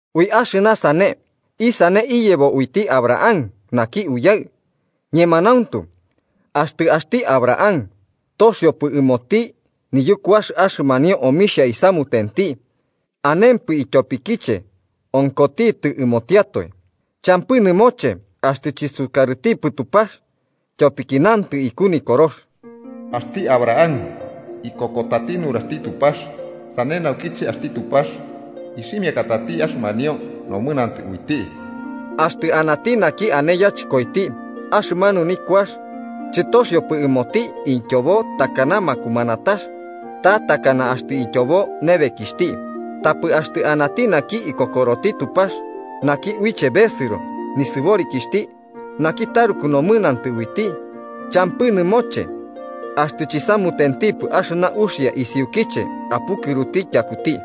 Ui axɨna sane, ¿isane iyebo uiti Abraham naki uyaɨ? Ñemanauntu, axtɨ axti Abraham toxiopɨ ɨmoti niyukuax axɨmanio omixhia isamutenti, anempɨ ityopiche onkotitɨ ɨmotiatoe, champɨ nɨmoche axtɨ chɨsukarɨtipɨ Tupax. Tyopiki nantɨ iku Nikorox: “Axti Abraham ikokotati nuraxti Tupax, sane naukiche axti Tupax ixhimiakatati axɨmanio nomɨnantɨ uiti.” Axtɨ anati naki ane yachɨkoiti, axɨmanu nikuax chɨtoxiopɨ ɨmoti ityobo takana makumanatax ta takana axtɨ ityobo nebekixhti. Tapɨ axtɨ anati naki ikokoroti Tupax, naki uiche besɨro nisɨborikixhti naki taruku nomɨnantɨ uiti, champɨ nɨmoche axtɨ chisamutentipɨ axɨna uxia isiukiche apukɨruti tyakuti.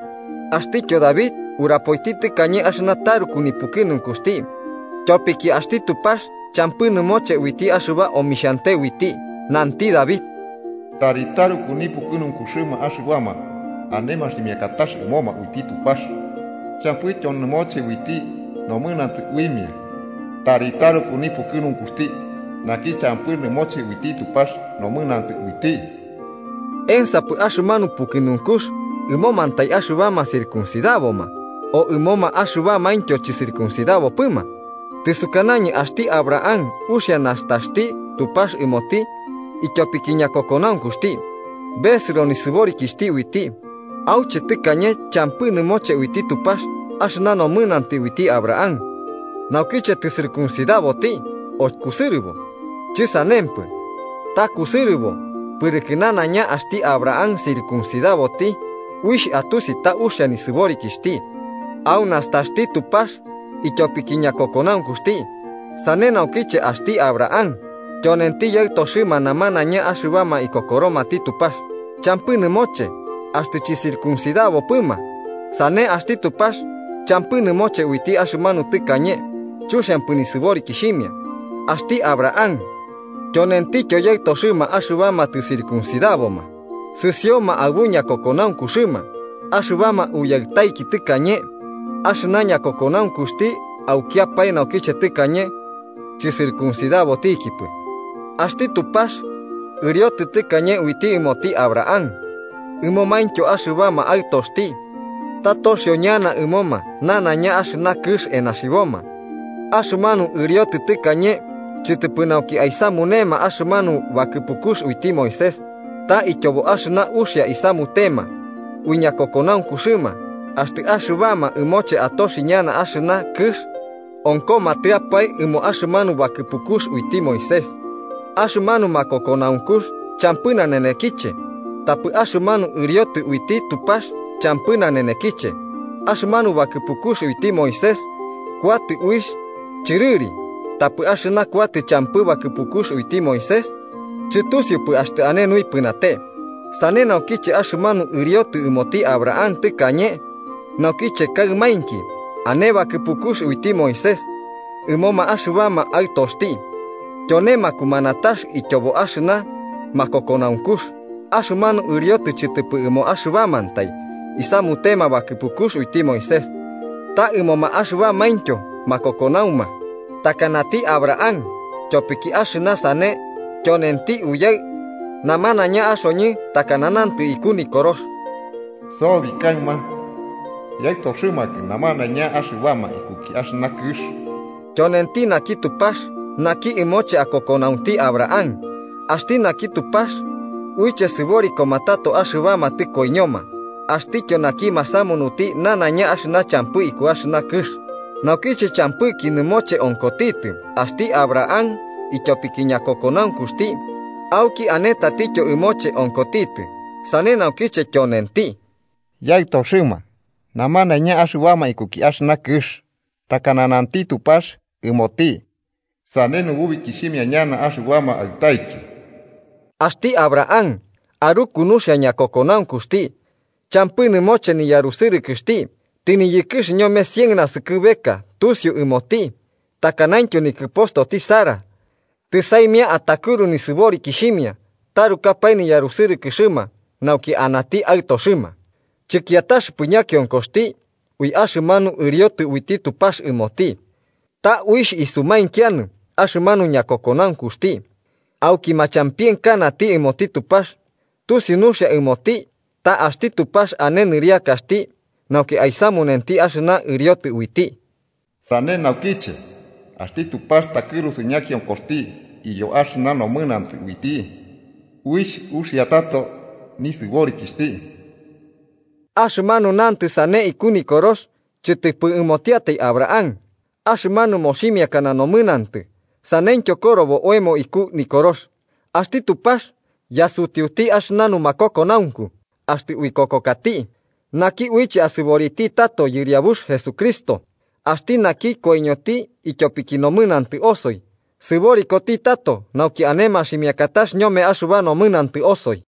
Axtityo David urapoiti tɨkañe axɨna taruku nipukɨnunkuxti naki tyopiki axti Tupax champɨ nɨmoche uiti axɨba omixhante uiti. Nanti David: “¡Tari taruku nipukɨnunkuxɨma axɨbama ane maximiakatax ɨmoma uiti Tupax champɨityo nɨmoche uiti nomɨnantɨ uimia! ¡Tari taruku nipukɨnunkuxti naki champɨ nɨmoche uiti Tupax nomɨnantɨ uiti!” ¿Ensapɨ axɨmanu pukɨnunkux ɨmomantai axɨbama circuncidaboma, o ɨmoma axɨbamaintyo chɨcircuncidabopɨma? Tɨsukanañɨ axti Abraham uxia nastaxti Tupax ɨmoti ityopiki ñakokonaunkuxti besɨro nɨsɨborikixhti uiti. ¿Auche tɨkañe champɨ nɨmoche uiti Tupax axɨna nomɨnantɨ uiti Abraham? ¿Naukiche tɨcircuncidaboti o kusɨrɨbo? Chɨsanempɨ, ta kusɨrɨbo. Pɨrɨkɨ nanaiña axti Abraham circuncidaboti, uixh atusi ta uxia nisɨborikixhti au nastaxti Tupax ityopiki ñakokonaunkuxti. Sane naukiche axti Abraham, tyonenti yaɨtoxɨma namanaiñama axɨbama ikokoromati Tupax, champɨ nɨmoche axtɨ chɨcircuncidabopɨma. Sane axti Tupax champɨ nɨmoche uiti axɨmanu tɨkañe chuxiampɨ nisɨborikixhimia. Axti Abraham tyonentityo yaɨtoxɨma axɨbama tɨcircuncidaboma, sɨsioma aɨbu ñakokonaunkuxɨma axɨbama uyaɨtaiki tɨkañe, axɨna ñakokonaunkuxti aukiapae naukiche tɨkañe chɨcircuncidabotikipɨ. Axti Tupax ɨriotɨ tɨkañe uiti ɨmoti Abraham ɨmomaintyo axɨbama aɨtoxti ta toxio ñana ɨmoma nanaiña axɨna kɨx enaxiboma. Axɨmanu ɨriotɨ tɨkañe chɨtɨpɨ nauki aisamunema axɨmanu bakɨpukux uiti Moisés, ta ityobo axɨna uxia isamutema ui ñakokonaunkuxɨma. Axtɨ axɨbama ɨmoche atoxi ñana axɨna kɨx onkomatɨapae ɨmo axɨmanu bakɨpukux uiti Moisés, axɨmanu makokonaunkux champɨ nanenekiche tapɨ axɨmanu ɨriotɨ uiti Tupax champɨ nanenekiche. Axɨmanu bakɨpukux uiti Moisés kuatɨ uixh chɨrɨri, tapɨ axɨna kauta champɨ bakɨpukux uiti Moisés, chɨtusiupɨ axtɨ ane nuipɨnate. Sane naukiche, axɨmanu ɨriotɨ ɨmoti Abraham tɨkañe nauki kaɨmainki ane bakɨpukux uiti Moisés ɨmoma axɨbama aɨtoxti, tyone makumanatax ityobo axɨna makokonaunkux. Axɨmanu ɨriotɨ chɨtɨpɨ ɨmo axɨbamantai isamutema bakɨpukux uiti Moisés, ta ɨmoma axɨbamaintyo makokonauma, takanati Abraham. Tyopiki axɨna sane tyonenti uyaɨ namanaiña axoñɨ, takana nantɨ iku Nikorox: “Sobi kaɨma yaɨtoxɨmakɨ ñamanaiña axɨbama ikuki axɨna kɨx.” Tyonenti naki Tupax, naki ɨmoche akokonaunti Abraham, axti naki Tupax, uiche sɨborikoma tato axɨbama tɨkoiñoma, axtityo naki masamunuti nanaiña axɨna champɨ iku axɨna kɨx. Naukiche champɨki nɨmoche onkotitɨ, axti Abraham ityopiki ñakokonaunkuxti auki ane tatityo ɨmoche onkotitɨ, sane naukiche tyonenti “yaɨtoxɨma namanaiña axɨbama iku axɨna kɨx”, takana nanti Tupax ɨmoti: “Sane nububikixhimia ñana axɨbama aɨtaiki.” Axti Abraham aruku nuxia ñakokonaunkuxti, champɨ nɨmoche niyarusɨrɨkɨxti tɨniyɨkɨx ñome cien naskɨbeka tusiu ɨmoti takanaintyo nikɨpostoti Sara tɨsaimia atakɨru nisɨborikixhimia tɨtarukapae niyarusɨrɨkɨxɨma nauki anati aɨtoxɨma. Chɨkiataxɨpɨ ñakionkoxti ui axɨmanu ɨriotɨ uiti Tupax ɨmoti, ta uixh isumainkianɨ axɨmanu ñakokonaunkuxti. Auki machampienkanati ɨmoti Tupax, tusiu nuxia ɨmoti ta axti Tupax ane nɨriakaxti nauki aisamunenti axɨna ɨriotɨ uiti. Sane naukiche axti Tupax takɨrusu ñakionkoxti iyo axɨna nomɨnantɨ uiti uixh uxia tato nisɨborikixhti. Axɨmanu nantɨ sane iku Nikorox chɨtɨpɨ ɨmotiatai Abraham, axɨmanu moximiakana nomɨnantɨ. Saneityo korobo oemo iku Nikorox. Axti Tupax yasutiuti axɨna numakokonaunku axtɨ uikokokati naki uiche asɨboriti tato Yɨriabux Jesucristo, axti naki koiñoti ityopiki nomɨnantɨ osoi sɨborikoti tato nauki ane maximiakatax ñome axɨba nomɨnantɨ osoi.